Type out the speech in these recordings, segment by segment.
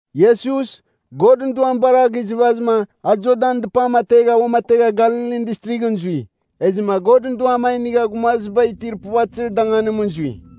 Iesus, Godɨn Duam bar a gizɨvazɨma a Jordanɨn dɨpam ategha uamategha Galilin Distrighɨn zui. Ezɨma Godɨn Duam a inigha gumaziba itir puvatɨzir danganimɨn zui.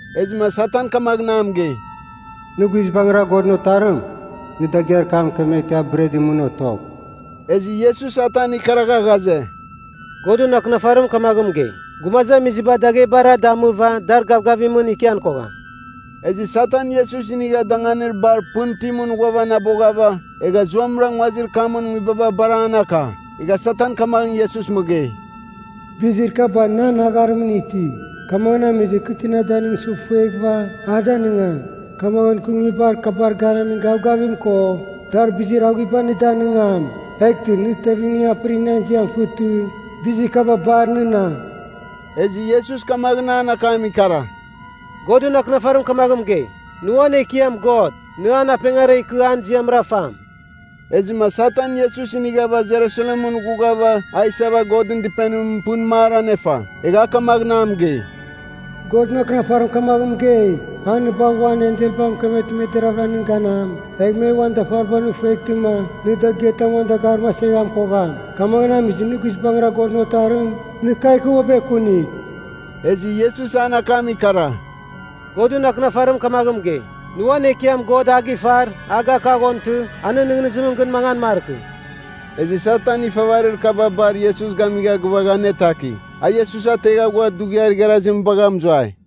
Ezɨma Satan kamaghɨn a mɨgei, “Nɨ guizbangɨra Godɨn Otarim, nɨ dagɨar kam mɨkemeghtɨma a bretɨn mɨn otogh.” Ezɨ Iesus Satan ikaragha ghaze, “Godɨn Akɨnafarim kamaghɨn mɨgei, ‘Gumazamiziba daghebara damɨva dar gavgavimɨn ikian kogham.’” Ezɨ Satan Iesus inigha danganir bar pɨn itimɨn ghuavanaboghava, egha zuamɨra nguazir kamɨn nguibaba bar an aka. Egha Satan kamaghɨn Iesus mɨgei, “Bizir kaba nan agharimɨn iti, kamaghɨn amizɨma kɨ tina danɨngsɨ fueghɨva, a danɨngam. Kamaghɨn kɨ nguibar kabar ganamin gavgavim ko, dar bizir aghuiba nɨ danɨngam. Eghtɨ nɨ tevimning apɨrigh nan ziam fɨtɨ, bizir kaba bar nɨna.” Ezɨ Iesus kamaghɨn an akam ikara, “Godɨn Akɨnafarim kamaghɨn mɨgei, ‘Nɨ uan Ekiam God, nɨ an apengara ikɨ an ziamra fam.’” Ezɨma Satan Iesus inighava Jerusalemɨn ghughava a isava Godɨn Dɨpenim pɨn mar anefa. Egha a kamaghɨn a mɨgei, “Godɨn Akɨnafarim kamaghɨn mɨgei, ‘A nɨ bagh uan enselbar mɨkemeghtɨma me deraghvɨra nɨn ganam, egh me uan dafaribar nɨ feghtɨma nɨ dagɨatam uan dagarim aseghan kogham!’ Kamaghɨn amizɨma nɨ guizbangɨra Godɨn Otarim, nɨ kagh ikɨ uabɨ ekunigh.” Ezɨ Iesus an akam ikara, “Godɨn Akɨnafarim kamaghɨn mɨgei, ‘Nɨ uan Ekiam God a gifar, a gakaghontɨ, a nɨn nɨghnɨzimɨn gɨn mangan markɨ.’” Ezɨ Satan ifavarir kaba bar Iesus gamigha gɨvagha anetaki. A Iesus ategha ghua dughiar igharazim bagha mɨzuai.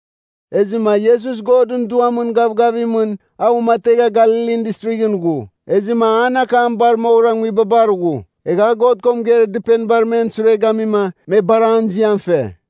Ezɨma Iesus Godɨn Duamɨn gavgavimɨn a uamategha Galilin Distrighɨn ghu. Ezɨma an akam bar moghɨra nguibabar ghu. Egha a God ko mɨgeir dɨpenibar men sure gamima, me bar an ziam fe.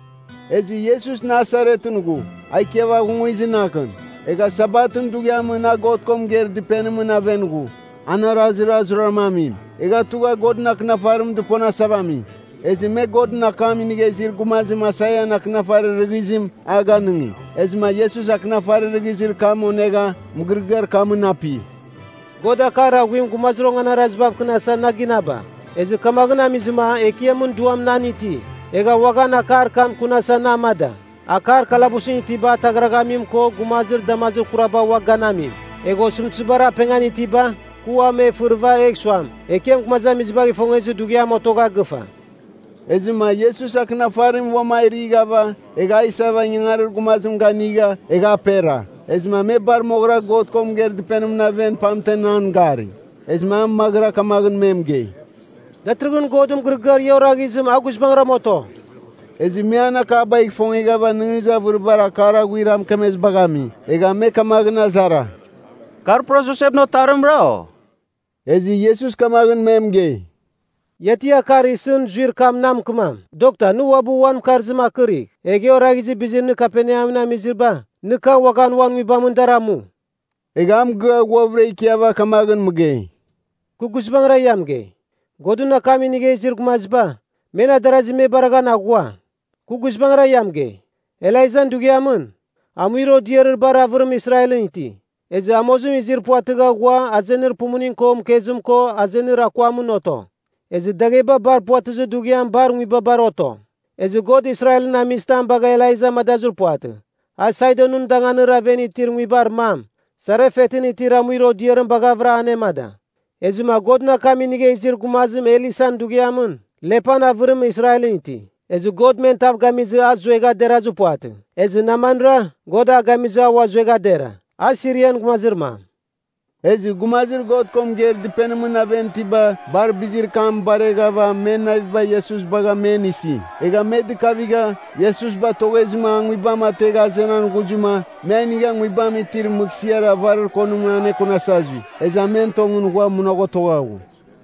Ezɨ Iesus Nasaretɨn ghu, a ikiava aghungizɨ naghɨn. Egha Sabatɨn dughiamɨn a God ko mɨgeir dɨpenimɨn aven ghu, an arazir a zuraram amim. Egha tugha Godɨn Akɨnafarim dɨponasava ami. Ezɨ me Godɨn akam inigha izir gumazim Aisaian akɨnafarir rɨghizim a ganɨngi. Ezɨma Iesus akɨnafarir rɨghizir kam onegha, mɨgɨrɨgɨar kamɨn api. “God akar aghuim gumazir onganarazibav kɨnasa na ginaba, ezɨ kamaghɨn amizɨma Ekiamɨn Duam nan iti. Egha uaghan akar kam kunasa na amada; akar kalabusɨn itiba ataghraghamim ko gumazir damazir kuraba ua ganamim. Egh osɨmtɨzibar apengan itiba kɨ ua me fɨrɨva egh suam, Ekiam gumazamizibagh ifongezir dughiam otogha gɨfa.” Ezɨma Iesus akɨnafarim uam a righava, egha a isava ingangarir gumazim ganigha, egha apera. Ezɨma me bar moghɨra God ko mɨgeir dɨpenimɨn aven pamtem an gari. Ezɨma a maghɨra kamaghɨn me mɨgei, “Datɨrɨghɨn Godɨn mɨgɨrɨgɨar ia oraghizim a guizbangram oto!” Ezɨ me an akabagh ifongeghava nɨghnɨzir avɨribar akar aghuir a mɨkemezibagh ami, egha me kamaghɨn azara, “Kar pura Josepɨn otarimra, o?” Ezɨ Iesus kamaghɨn me mɨgei, “Ia ti akar isɨn zuir kam na mɨkɨmam, ‘Dokta nɨ uabɨ uan mɨkarzim akɨrigh!’ Egh e oraghizir bizir nɨ Kaperneamɨn amiziba nɨ kagh uaghan uan nguibamɨn dar amu.” Egha a mɨgɨa ghuavɨra ikiava kamaghɨn mɨgei, “Kɨ guizbangɨra ia mɨgei, Godɨn akam inigha izir gumaziba, men adarazi me baraghan aghua. Kɨ guizbangɨra ia mɨgei, Elaijan dughiamɨn, amuir odiarir bar avɨrim Israelɨn iti. Ezɨ amozim izir puvatɨgha ghua azenir pumuning ko mɨkezim ko azenir akuamɨn oto. Ezɨ dagheba bar puvatɨzir dughiam bar nguibabar oto. Ezɨ God Israelɨn amizitam bagha Elaija amadazir puvatɨ. A Sidonɨn danganir aven itir nguibar mam, Sarefetɨn itir amuir odiarim baghavɨra anemada. Ezɨma Godɨn akam inigha izir gumazim Elisan dughiamɨn, lepan avɨrim Israelɨn ti. Ezɨ God men tav gamizɨma a zuegha derazir puvatɨ. Ezɨ Namanra, God a gamizɨma a zuegha dera, a Sirian gumazir mam.” Ezɨ gumazir God ko mɨgeir dɨpenimɨn aven itiba bar bizir kam bareghava men naviba Iesus bagha men isi. Egha me dɨkavigha, Iesus batoghezɨma a nguibam ategha azenan ghuzɨma, me a inigha nguibam itir mɨghsɨar avarir konim anekunasa zui. Ezɨ a men tongɨn ghua munagh otogha ghu.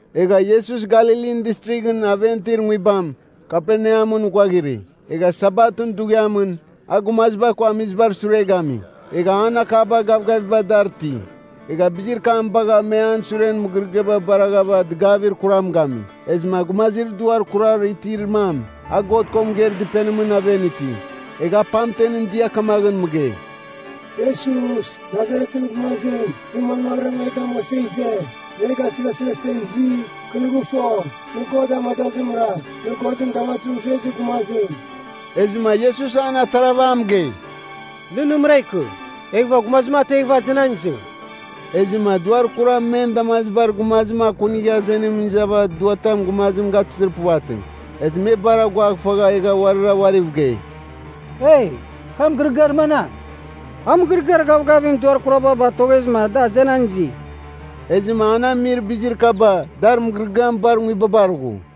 Egha Iesus Galilin Distrighɨn aven itir nguibam, Kaperneamɨn ghuaghiri. Egha Sabatɨn dughiamɨn, a gumaziba ko amizibar sure gami. Egha an akaba gavgavim dar ti. Egha bizir kam bagha me an suren mɨgɨrɨgɨaba baraghava dɨgavir kuram gami. Ezɨma gumazir duar kurar itir mam, a God ko mɨgeir dɨpenimɨn aven iti. Egha a pamtem dia kamaghɨn mɨgei, “Iesus, Nasaretɨn gumazim, nɨ manmaghɨra e damuasa ize? Nɨ e gasɨghasɨghasa izi? Kɨ nɨ gɨfo, nɨ God amadazimra, nɨ Godɨn damazimɨn zuezir gumazim!” Ezɨma Iesus an atarava a mɨgei, “Nɨ nɨmɨra ikɨ! Eghɨva gumazim ateghɨva azenan izɨ!” Ezɨma duar kuram men damazibar gumazim akunigha azenimɨn izava duatam gumazim gatɨzir puvatɨ. Ezɨ me bar aguaghfagha egha uarira uariv gei. “Eei, kar mɨgɨrɨgɨar manam? A mɨgɨrɨgɨar gavgavimɨn duar kuraba batoghezɨma da azenan izi.” Ezɨma an amir bizir kaba, dar mɨgɨrɨgɨam bar nguibabar ghu.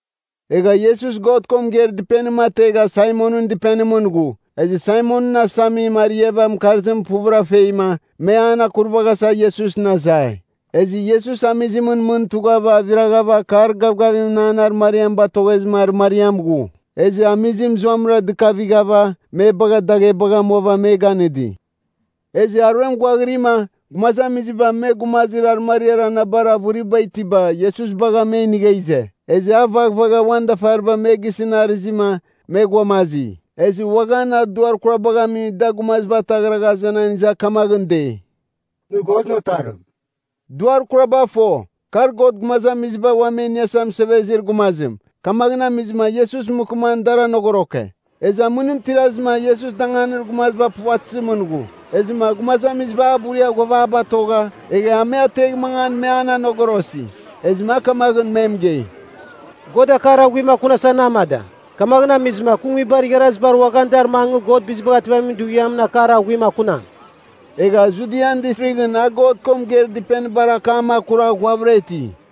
Egha Iesus God ko mɨgeir dɨpenim ategha Saimonɨn dɨpenimɨn ghu. Ezɨ Saimonɨn asamim ariava mɨkarzim puvɨra feima, me an akuravaghasa Iesusɨn azai. Ezɨ Iesus amizimɨn mɨn tugha aviraghava akar gavgavimɨn an arɨmariam batoghezɨma arɨmariam ghu. Ezɨ amizim zuamɨra dɨkavighava me bagha daghebagh amuava me ganɨdi. Ezɨ aruem ghuaghirima, gumazamiziba me gumazir arɨmariar anabar avɨriba itiba Iesus bagha me inigha ize. Ezɨ a vaghvagha uan dafariba me gisɨn arɨzima me ghuamazi. Ezɨ uaghan a duar kurabagh ami da gumaziba ataghragha azenan iza kamaghɨn dei, “Nɨ Godɨn Otarim!” Duar kuraba fo, kar God Gumazamiziba Ua Me Iniasa Mɨsevezir Gumazim. Kamaghɨn amizɨma Iesus mɨkɨman dar anogoroke. Ezɨ amɨnim tirazɨma Iesus danganir gumaziba puvatɨzimɨn ghu. Ezɨma gumazamiziba a buria ghuava a batogha, egha a me ategh mangan me an anogorosi. Ezɨma a kamaghɨn mɨgei, “God akar aghuim kunasa na amada. Kamaghɨn amizɨma kɨ nguibar igharazibar uaghan dar mangɨ God Bizibagh Ativamin Dughiamɨn akar aghuim akunam.” Egha Judian Distrighɨn a God ko mɨgeir dɨpenibar akam akura ghuavɨra iti.